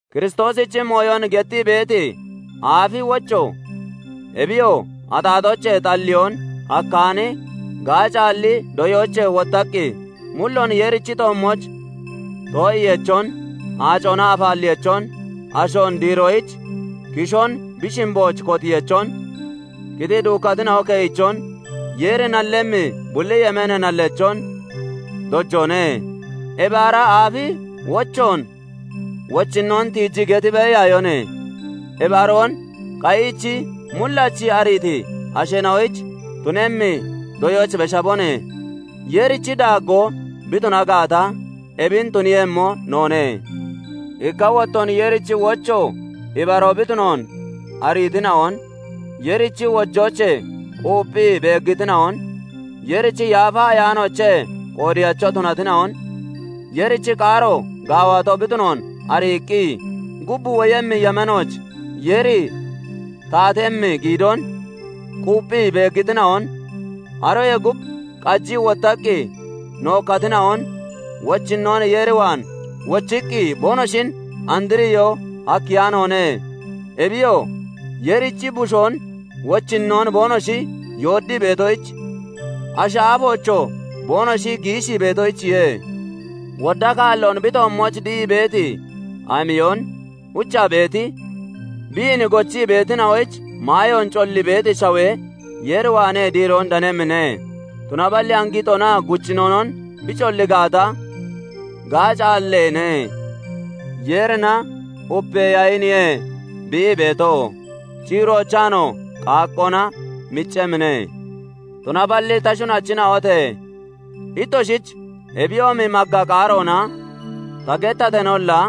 Kiristoosichi mooyon gettii beeti aafi wocho, ebiyoo axaaxoochee xalliyoon hakkaani, gaacaalli doyoochee wottaqqi, mulloon Yeerichi toommooch too'iyeechon, aacona afaalleyeechon, ashoon diiroyich kishoon bi shimbooch kotiyeechon, qitii duukkatina'o keyichon, Yeeri nallemmi bulli yemeenee nalleechon dojoone. Ebi ara aafi wochoon wochinnoon tiiji geti beeyaayone. Ebi aroon qayiichi, mullachi ariiti asheena'oyich tunemmi doyooch beshabone. Yeerichi daaggoo bi tuna gaata, ebin tuniiyemmo noone. Ikka wottoon Yeerichi wocho ibaroo bi tunoon ariitina'on, Yeerichi wojoochee quupphii beeggitina'on, Yeerichi Yaafa Ayaanoochee qoodeyacho tunatina'on, Yeerichi qaaro gaawato bi tunoon ariiqqi, gub woyemmi yemeenooch Yeeri taatemmi giidoon quupphii beeggitina'on, aroyee gub qajii wottaqqi nookkatina'on, wochinnoon Yeer waan wochiqqi boonoshin andriyoo hakkeyaanoone; Ebiyoo, Yeerichi Bushoon wochinnoon boonoshi yooddii beetoyich, ashi aafoochoo boonoshi giishii beetoyichiye. Wodda kaalloon bi toommooch dihii beeti amiyon uchaa beeti, biin gochii beetina'oyich maayoon collii beeti shawe Yeer waanee diiroon danemmine; tunaballi angixonaa guccinonon bi collii gaata, gaacaalleene; Yeerina upeeyaniye bi ii beeto; ciiroochaanoo qaaqqoona miccemmine. Tunaballi ta shunachina'ote! Ittoshich ebiyoomi magga qaaroona ta gettateenolla,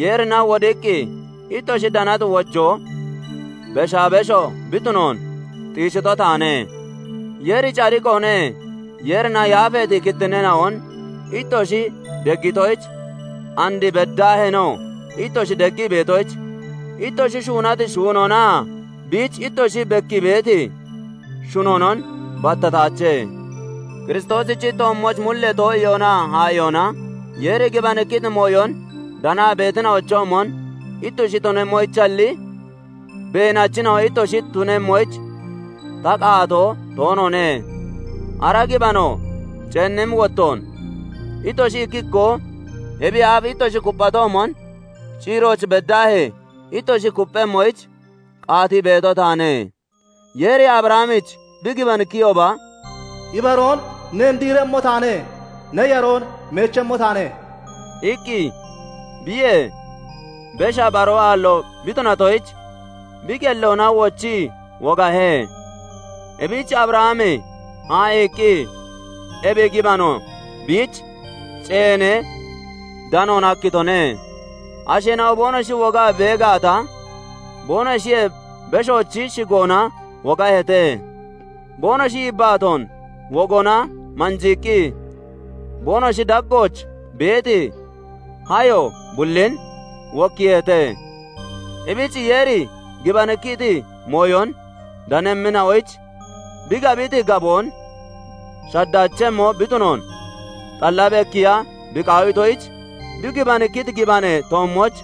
Yeerina wodiqqi ittoshi danati wojoo beshaa beshoo bi tunoon xiishito taane. Yeeri cadiqoone; Yeerina yaafeeti kittinneena'on ittoshi deggitoyich, and beddaaheenoo ittoshi deggii beetoyich, ittoshi shuunati shuunoonaa biich ittoshi bekkii beeti shunoonon battataache. Kiristoosichi toommooch mullee too'iyoonaa haa'iyoona Yeeri gibanikkiti mooyon danaa beetina'ochoomon ittoshi tunemmoyichalli, beenachina'o ittoshi tunemmoyich ta qaatoo toonoone; ara gibano ceennimmi wottoon ittoshi ikki ikkoo ebiyee aaf ittoshi kupphatoomon, ciirooch beddaahee ittoshi kupphemmoyich qaatii beeto taane. Yeeri Abrahamich bi gibanikkiyooba, "Ibaroon neen diiremmo taane; ne yaroon meechemmo taane" iqqi, biyee besha baroo aallo bi tunatoyich, bi qelloona wochii wogahe. Ebich Abrahami haa'iiqqi ebi gibano biich ceenee danoon hakkitone. Asheena'o boonoshi wogaa bee gaata, boonoshiyee beshoochi shigoona wogaheete; boonoshi yibbaatoon wogoona manjiiqqi boonoshi daggooch beeti hayo (nabo) bullin wokkiiheete. Ebich Yeeri gibanikkiti mooyon danemmina'oyich, bi gabiti gaboon shaddaachemmo bi tunoon xalla bekkiiya bi qaawitoyich, bi gibanikkiti gibanee toommooch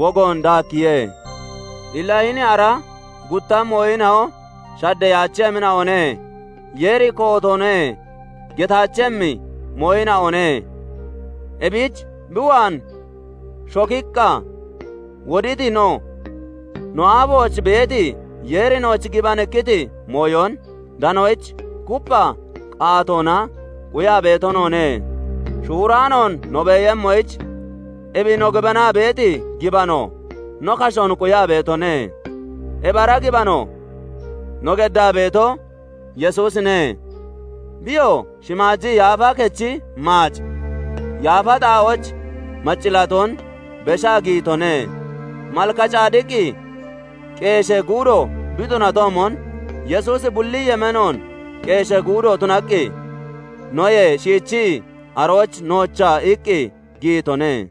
wogoon daakkiye. Illa hini ara gutta mooyina'o shaddeyaachemmina'one; Yeeri "Kootoone" getaachemmi mooyina'one; ebich bi waan shokiqqa woditi no, no aafooch beeti, Yeeri nooch gibanikkiti mooyon danoyich kuppha qaatoona quyaa beeto noone. Shuuraanoon no beeyemmoyich, ebi no gibanaa beeti gibano no kashoon quyaa beetone; ebi ara gibano no geddaa beeto, Yesuusine; biyoo shimaaji yaafa kechi maaci yaafa xaa'ooch maccillaatoon beshaa giyitone. Malkacadiqi qeeshee guudo bi tunatoomon, Yesuusi bulli yemeenoon qeeshee guudo tunaqqi, noyee shiichii arooch noocha iqqi giyitone.